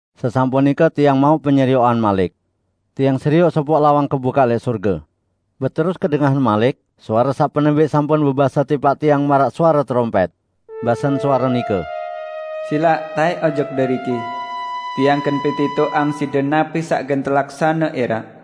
Sesampun nike tiang mauq penyerioqan malik. Tiang serioq sopoq lawang kebukaq lẽq sorge. Beterus kedengahan malik suare saq penembẽq sampun bebase tipaq tiang maraq suare terompẽt. Basen suare nike, "Silaq taẽk ojok deriki. Tiang gen petitoqang side napi saq gen telaksane ẽraq."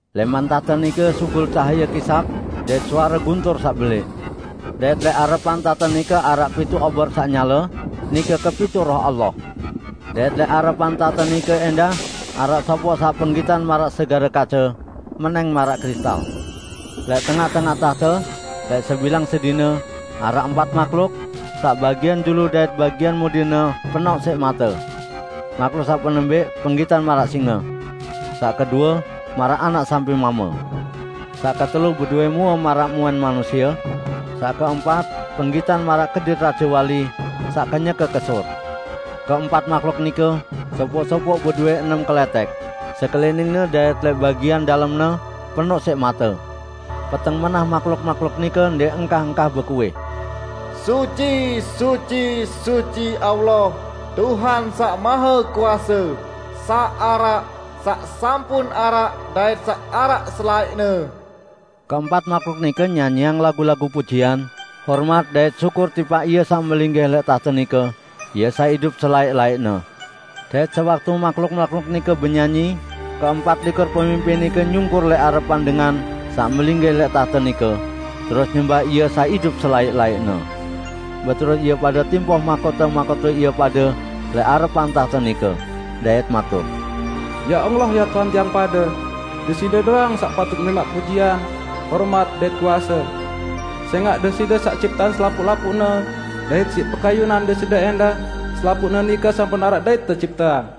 Lẽman tahte nike sugul cahaye kisap dait suare guntur saq belẽq. Dait lẽq arepan tahte nike araq pituq obor saq nyale; nike kepituq Roh Allah. Dait lẽq arepan tahte nike ẽndah araq sopoq saq penggitan maraq segare kace, menẽng maraq kristal. Lẽq tengaq-tengaq tahte, lẽq sebilang sedine, araq empat mahluk, saq bagian julu dait bagian mudine penoq siq mate. Mahluk saq penembẽq penggitan maraq singe. Saq kedue, maraq anak sampi mame. Saq ketelu bedowẽ mue maraq muen manusie. Saq keempat, penggitan maraq kedit rajewali saq kenyeke kesur. Keempat mahluk nike, sopoq-sopoq bedowẽ enem kelẽtẽk, sekeliningne dait lẽq bagian dalemne penoq siq mate. Peteng menah mahluk-mahluk nike ndẽq engkah-engkah bekuih, "Suci, suci, suci, Allah, Tuhan Saq Mahekuase; saq araq, saq sampun araq, dait saq araq selaẽqne." Keempat mahluk nike nyanyiang lagu-lagu pujian, hormat dait syukur tipaq Ie saq melinggih lẽq tahte nike, Ie saq idup selaẽq-laẽqne. Dait sewaktu mahluk-mahluk nike benyanyi, keempat likur pemimpin nike nyungkur lẽq arepan Dengan saq melinggih lẽq tahte nike, terus nyembah Ie saq idup selaẽq-laẽqne. Beterus ie pade timpoh mahkote-mahkote ie pade lẽq arepan tahte nike, dait matur, "Ya Allah, Ya Tuhan tiang pade! Deside doang saq patut nerimaq pujian, hormat dait kuase. Sẽngaq Deside saq cipteang selapuq-lapuqne, dait siq pekayunan Deside ẽndah selapuqne nike sampun araq dait tecipteang."